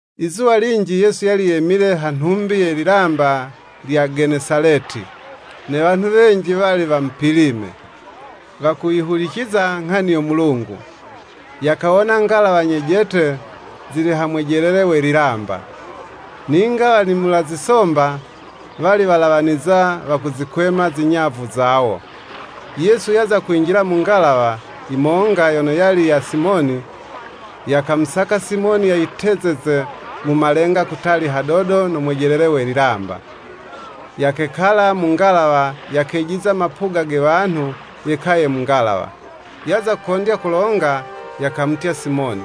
Izuwa linji Yesu yali yemile ha nhumbi ye lilamba lya Genesaleti, ne wanhu wenji wali wamupilime, wakuyihuliciza Nghani yo Mulungu, yakawona ngalawa nyejete zili ha mwejelele we lilamba; ninga wanimula zisomba wali walawaniza wakuzikwema zinyavu zawo, Yesu yaza kwinjila mu ngalawa yimonga yono yali ya Simoni, yakamusaka Simoni yayitezeze mu malenga kutali hadodo no mwejelele we lilamba, yakekala mu ngalawa yakagejiza mapuga ge wanhu yekaye mu ngalawa. Yaza kondya kulonga, yakamutya Simoni,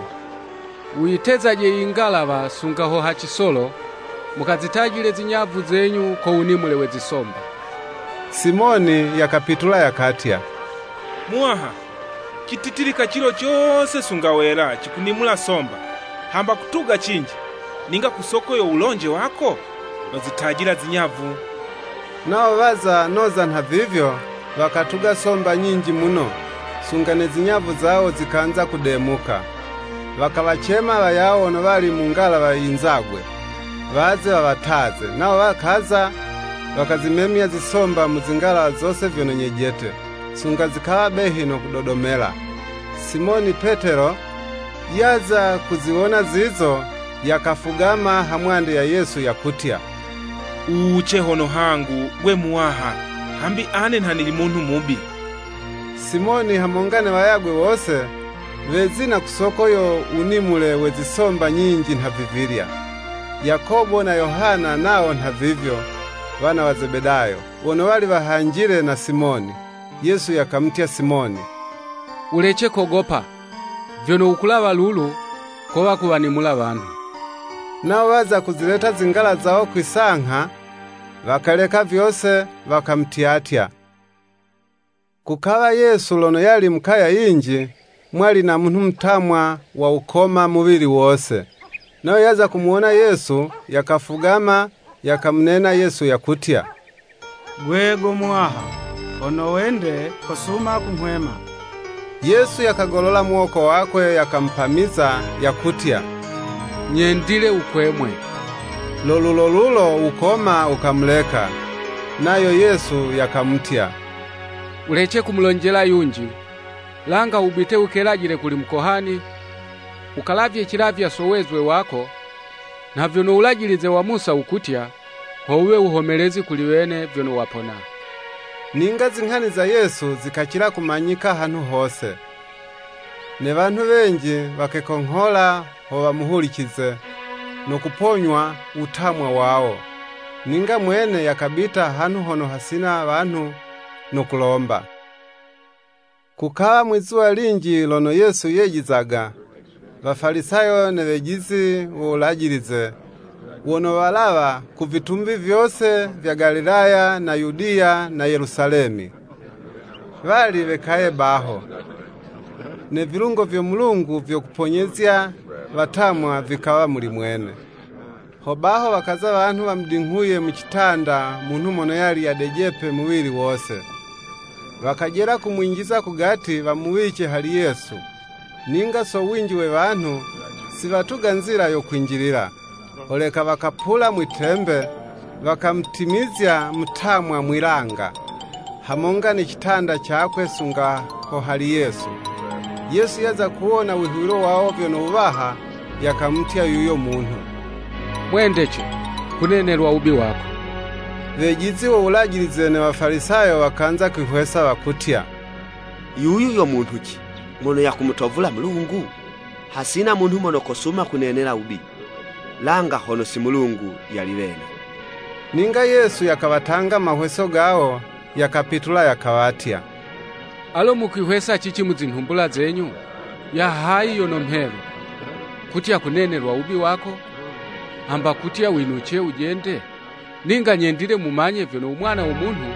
“Wuyitezaje i ngalawa sunga ha cisolo, mukazitajile zinyavu zenyu ko wunimule we zisomba.” Simoni yakapitula yakatya, “Muwaha, cititilika cilo cose sunga wela cikunimula somba, hamba kutuga cinji, ninga ku so wulonje wako, nozitajila zinyavu.” Nawo waza noza nhavivyo, wakatuga somba nyinji muno, sunga ne zinyavu zawo zikanza kudemuka, wakawacema wayawo wono wali mu ngalawa yinzagwe, waze wawataze, nawo wakaza, wakazimemya zisomba mu zi ngalawa zose vyono nyejete, sunga zikawa behi no kudodomela. Simoni Petelo yaza kuziwona zizo, yakafugama hamwande ya Yesu, yakutya “Wuwuce hono hangu, Gwe Muwaha, hambi ane nha nili munhu mubi.” Simoni hamonga ne wayagwe wose, wezina ku soko yo wunimule we zisomba nyinji nhavivilya. Yakobo na Yohana nawo nhavivyo, wana wa Zebedayo, wono wali wahanjile na Simoni. Yesu yakamutya Simoni, “Wulece kogopa, vyono wukulawa lulu kowa kuwanimula wanhu.” Nawo waza kuzileta zingalawa zawo kwi'sangha, wakaleka vyose, wakamutyatya. Kukawa Yesu lono yali mu kaya yinji, mwali na munhu mutamwa wa wukoma muwili wose, nayo yaza kumuwona Yesu, yakafugama yakamunena Yesu yakutya, “Gwe go Muwaha, hono wende, kosuma kunghwema.” Yesu yakagolola muwoko wakwe, yakamupamiza, yakutya, “Nyendile wukwemwe.” Lo lulolulo wukoma wukamuleka. Nayo Yesu yakamutya “Wulece kumulonjela yunji: langa wubite, wukelajile kuli mukohani, wukalavye cilavywa so wezwe wako, nha vyono Wulajilize wa Musa wukutya, ho wuwe wuhomelezi kuli wene vyono wapona.” Ninga zinghani za Yesu zikacila kumanyika hanhu hose. Ne wanhu wenji wakekonghola ho wamuhulicize, no kuponywa wutamwa wawo. Ninga mwene yakabita hanhu hono hasina wanhu no kulomba. Kukawa mwizuwa linji lono Yesu yejizaga: Wafalisayo ne wejizi wo Wulajilize, wono walawa ku vitumbi vyose vya Galilaya na Yudiya na Yelusalemi wali wekaye baho; ne vilungo vyo Mulungu vyo kuponyezya watamwa vikawa muli mwene. Hobaho wakaza wanhu wamudinghuye mu citanda munhu mono yali yadejepe muwili wose; wakajela kumwinjiza kugati, wamuwice hali Yesu. Ninga so winji we wanhu, si watuga nzila yo kwinjilila, holeka wakapula mwi'tembe, wakamutimizya mutamwa mwi'langa, hamonga ne citanda cakwe sunga ho hali Yesu. Yesu yaza kuwona wihuwilo wawo vyono wuwaha, yakamutya yuyo munhu. “Mwendece, kunenelwa wubi wako.” Wejizi wo Wulajilize ne Wafalisayo wakanza kwihwesa, wakutya, “Yuyu yo munhu ci, mono yakumutovula Mulungu? Hasina munhu mono kosuma kunenela wubi, langa hono si Mulungu yali wene.” Ninga Yesu yakawatanga mahweso gawo, yakapitula yakawatya, “Alo mukwihwesa cici mu zinhumbula zenyu?” Ya hayi yono mhelu, kutya Kunenelwa wubi wako, hamba kutya winuce wujende? Ninga nyendile mumanye vyono u Mwana wo Munhu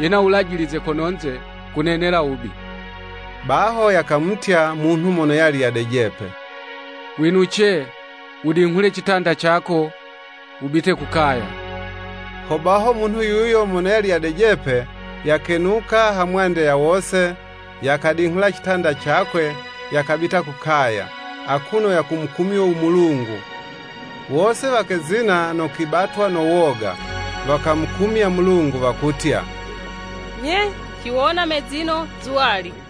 yena Wulajilize kono'nze kunenela wubi. Baho yakamutya munhu mono yali yadejepe, “Winuce, wudinghule citanda cako wubite ku kaya.” Hobaho munhu yuyo mono yali yadejepe, yakenuka ha mwande ya wose, yakadinghula citanda cakwe, yakabita ku kaya, akuno yakumukumyo u Mulungu. Wose wakezina no kwibatwa no woga, wakamukumya Mulungu, wakutya, “Nye, ciwona mezino zuwali!”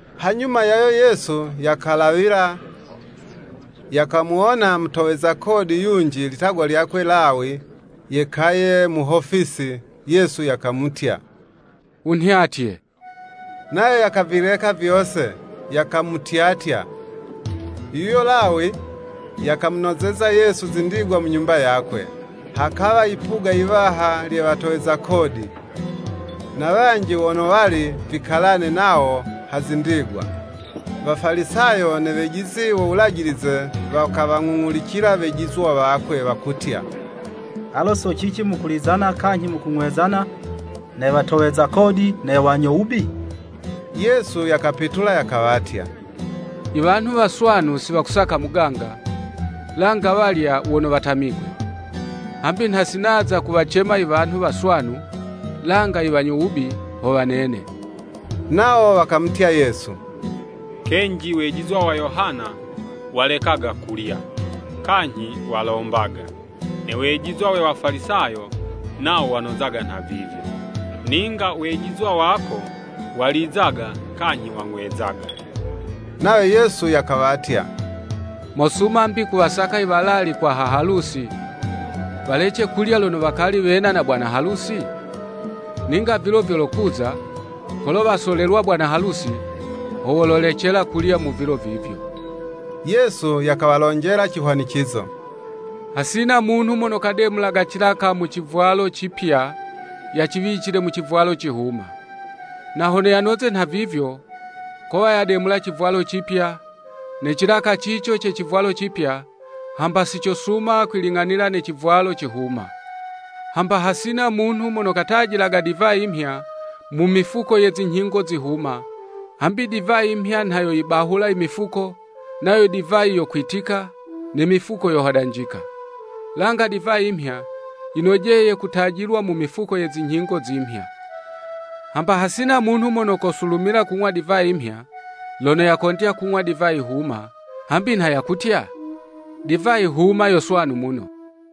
Hanyuma yayo Yesu yakalawila, yakamuwona mutoweza kodi yunji litagwa lyakwe Lawi yekaye mu hofisi, Yesu yakamutya “Wunhyatye.” Nayo yakavileka vyose, yakamutyatya. Yuyo Lawi, yakamunozeza Yesu zindigwa mu nyumba yakwe. Hakawa yipuga yiwaha lye watoweza kodi, na wanji wono wali vikalane nawo ha zindigwa. Wafalisayo ne wejizi wo Wulajilize wakawang'ung'ulicila wejizwa wakwe; wakutya, “Alo so cici mukulizana kanyhi mukung'wezana ne watoweza kodi ne wanyo wubi?” Yesu yakapitula yakawatya, “Iwanhu waswanu si wakusaka muganga; langa walya wono watamigwe. Hambi nha si naza kuwacema i wanhu waswanu, langa i wanyo wubi, ho wanene.” Nawo wakamutya Yesu, “Kenji wejizwa wa Yohana walekaga kulya, kanyhi walombaga; ne wejizwa we Wafalisayo nawo wanozaga nhavivyo; ninga wejizwa wako, walizaga kanyhi wang'wezaga.” Nayo Yesu yakawatya, “Mosuma 'mbi kuwasaka i walalikwa ha halusi, walece kulya lono wakali wena na bwana halusi? Ninga vilo vyolokuza; kolo wasolelwa bwana halusi, ho wololecela kulya mu vilo vivyo.” Yesu yakawalonjela cihwanicizo; “Hasina munhu mono kademulaga cilaka mu civwalo cipya, yaciwicile mu civwalo cihuma, na hono yanoze nhavivyo, kowa yademula civwalo cipya, ne cilaka cico ce civwalo cipya hamba si vyosuma kwiling'anila ne civwalo cihuma. Hamba hasina munhu mono katajilaga divayi mhya, mu mifuko ye zinyhingo zihuma, hambi divayi mhya nha yoyibahula i mifuko, nayo divayi yokwitika, ne mifuko yohodanjika. Langa divayi mhya, yinojeye kutajilwa mu mifuko ye zinyhingo zimhya. Hamba hasina munhu mono kosulumila kanyhi kung'wa divayi mhya, lono yakondya kung'wa divayi huma, hambi nha yakutya, ‘Divayi huma yo swanu muno.'"